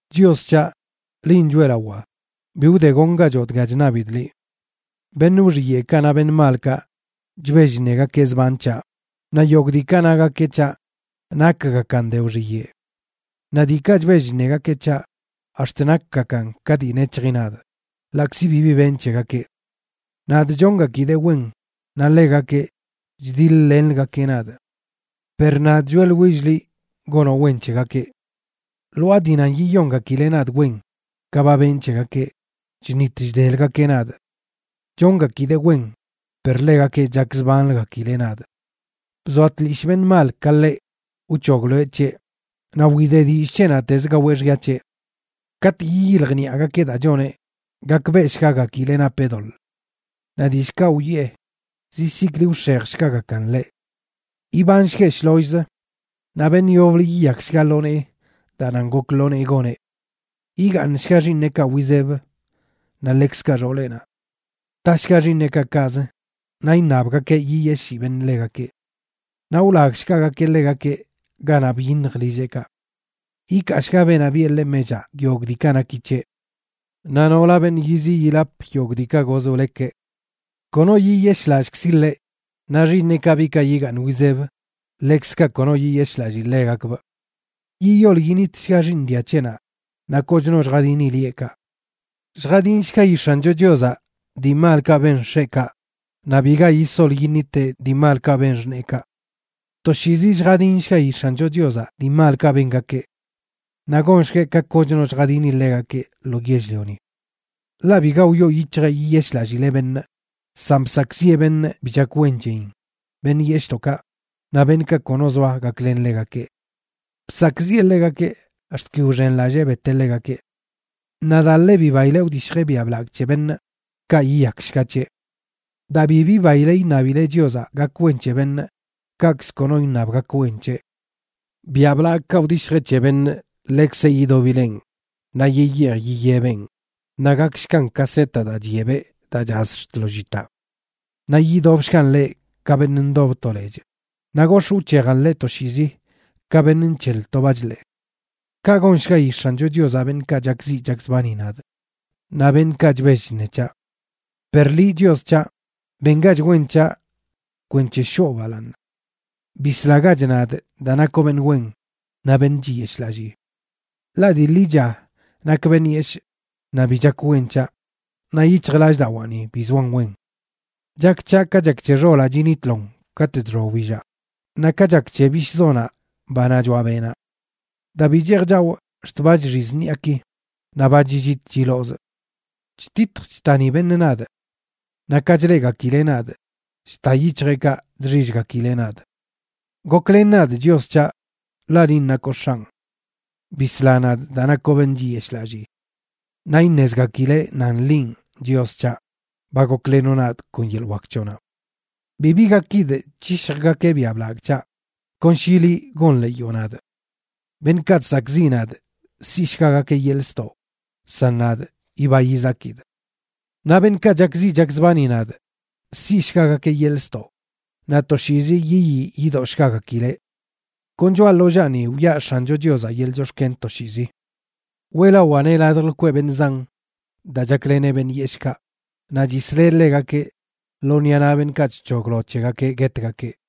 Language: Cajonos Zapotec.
Chios c̱haꞌ, linꞌ choeꞌlawaa, bi wdegongachoꞌ dga chṉabidꞌ liꞌ. Beṉꞌ wxiyeꞌkaꞌ naꞌ beṉꞌ malkaꞌ chbell chṉegakeꞌ zban c̱haꞌ, naꞌ yogꞌ diikaꞌ nagakeꞌ c̱haꞌ nakgakan de wxiyeꞌ. Naꞌ diikaꞌ chbell chṉegakeꞌ c̱haꞌ ax̱t nakgakan ka dii nec̱hji nadꞌ, ḻaꞌkzi bibi benꞌ c̱hegakeꞌ. Nadꞌ chongakidee wen, naꞌ ḻegakeꞌ chdiḻ-lenləgakeꞌ nadꞌ. Per nadꞌ choeꞌḻwillꞌ liꞌ gonoꞌ wen c̱hegakeꞌ. Lwaa dii nan yiyongakileꞌ nadꞌ wen ka ba benꞌ c̱hegakeꞌ, chṉit chdeləgakeꞌ nadꞌ. Chongakidee wen, per ḻegakeꞌ chakzbanləgakileꞌ nadꞌ. Bzoa tlishꞌ beṉꞌ mal ka ḻeꞌ, wc̱hogloeꞌ c̱heꞌ, naꞌ wide dillꞌ c̱heꞌnaꞌtez gaweꞌ xya c̱heꞌ. Katꞌ yiyiljniꞌagakeꞌ daa choneꞌ gakbeꞌshgagakileꞌ napeꞌ doḻꞌ. Naꞌ dillꞌkaꞌ wiꞌe zizikli wx̱ejshgagakan ḻeꞌ. Ibanshgueꞌ shlollzə, naꞌ beṉꞌ yoblə yiyakshga lo nee daa nan gok lo nee goneꞌ. Yigaaṉshga x̱iineꞌkaꞌ wizeb naꞌ ḻekzkaꞌ xooleꞌnaꞌ. ¡Tashga xiiṉeꞌkaꞌ kaꞌz naꞌ iṉabgakeꞌ yiyeshii beṉꞌ ḻegakeꞌ! Naꞌ wlagshgagakeꞌ ḻegakeꞌ ganaꞌ byiṉj lilleꞌkaꞌ. Yikaashga beenaꞌ biꞌe ḻeꞌ mechaꞌ yogꞌ diikaꞌ naki c̱heꞌ. Naꞌ nola beṉꞌ yiziꞌ yilap yogꞌ diikaꞌ goz wlekeꞌ. Kono yiyeshꞌlallꞌkzi ḻeꞌ, naꞌ xiiṉeꞌkaꞌ, biꞌkaꞌ yigaaṉ wizeb, ḻekzkaꞌ kono yiyeshꞌlallii ḻegakbꞌ. Yiyol yinitshga xiiṉ dia c̱heꞌnaꞌ naꞌ koch no lljadini lieꞌkaꞌ. Lljadinshgayi X̱ancho Chiozaꞌ dii malkaꞌ ben x̱eꞌkaꞌ, naꞌ biga yisol yiṉiteꞌ dii malkaꞌ beṉꞌ xṉeekaꞌ. Toshiizi lljadinshgayi X̱ancho Chiozaꞌ dii malkaꞌ bengakeꞌ naꞌ gonshgueꞌ ka kochno lljadini ḻegakeꞌ lo yell-lioni. Ḻaꞌ biga wyoo yic̱hjeꞌ yiyeshꞌlallileꞌ beṉꞌ, san bsakꞌziꞌe beṉꞌ bi chak wen c̱heyin, beṉꞌ yeshꞌdoꞌkaꞌ, naꞌ beṉꞌkaꞌ kono zoa gaklen ḻegakeꞌ. Bsakꞌziꞌe ḻegakeꞌ ax̱t ki wxenlallee beteꞌ ḻegakeꞌ. Naꞌ daa ḻe bibaileꞌ wdishjeꞌ biaꞌ blagꞌ c̱he beṉꞌ, kaꞌ yiyakshga c̱heꞌ. Daa bi bibaile iṉabileꞌ Chiozaꞌ gak wen c̱he beṉꞌ, kaꞌkz kono iṉab gak wen c̱heꞌ. Biaꞌ blagkaꞌ wdishjeꞌ c̱he beṉꞌ, ḻekzeꞌ yidobileꞌn naꞌ yiyeej yiyebeꞌn, naꞌ gakshgan ka set daa chyebeꞌ daa chaz ax̱t ḻoo llitaꞌ. Naꞌ idobshgan ḻeꞌ ka beṉꞌ ndob to lechꞌ, naꞌ gox̱ꞌ wc̱hejan ḻeꞌ toshiizi ka beṉꞌ nc̱heḻ to bachḻee. Kaꞌ gonshgayi X̱ancho Chiozaꞌ beṉꞌkaꞌ chakziꞌ chakzbani nadꞌ, naꞌ beṉꞌkaꞌ chbell chṉe c̱haꞌ. Per liꞌ, Chios c̱haꞌ, bengach wen c̱haꞌ kwenc̱he shoo balaaṉ. Bislagach nadꞌ daa nakoꞌ beṉꞌ wen naꞌ beṉꞌ chiyeshꞌlallii. Ḻaꞌ dii ḻicha nakꞌ beṉꞌ yeshꞌ, naꞌ bi chak wen c̱haꞌ, naꞌ yic̱hjlallꞌdawaani bi zoan wen. Chak c̱haꞌ ka chak c̱he xolaꞌ chinitlon katꞌ chxoa wbillaꞌ, naꞌ ka chak c̱he bishꞌzonaꞌ, banaꞌ choaꞌ beꞌnaꞌ. Daa bi cheej chawꞌ ax̱t ba chxiz ṉiꞌaki, naꞌ ba chillit chilozꞌ. Chtitj chtani beṉꞌ nadꞌ. Naꞌ ka chleꞌgakileꞌ nadꞌ, chta yic̱hjeꞌkaꞌ chxillgakileꞌ nadꞌ. Goklen nadꞌ, Chios c̱haꞌ, ḻaꞌ linꞌ nakoꞌ X̱anꞌ. Bisla nadꞌ daa nakoꞌ beṉꞌ chiyeshꞌlallii. Naꞌ iṉezgakileꞌ nan linꞌ, Chios c̱haꞌ, ba goklenoꞌ nadꞌ kon yeḻꞌ wak c̱hoꞌnaꞌ. Bibi gakidꞌ c̱hishjgakeꞌ biaꞌ blagꞌ c̱haꞌ, kon shi liꞌ gonḻeeyoꞌ nadꞌ. Beṉꞌkaꞌ chsakꞌziꞌ nadꞌ siꞌshgagakeꞌ yeḻꞌ ztoꞌ, san nadꞌ, yiba yizakidꞌ. Naꞌ beṉꞌkaꞌ chakziꞌ chakzbani nadꞌ siꞌshgagakeꞌ yeḻꞌ ztoꞌ, naꞌ toshiizi yiyii yidoshgagakileꞌ. Kon choꞌa ḻollaani wiꞌa X̱ancho Chiozaꞌ yeḻꞌ chox̱ken toshiizi. Weꞌlawaaneꞌ ladj lkweꞌ beṉꞌ zan, daa chakleneꞌ beṉꞌ yeshꞌkaꞌ naꞌ chisleꞌ ḻegakeꞌ lo ṉiꞌa naꞌ beṉꞌkaꞌ chc̱hoglo c̱hegakeꞌ guetgakeꞌ.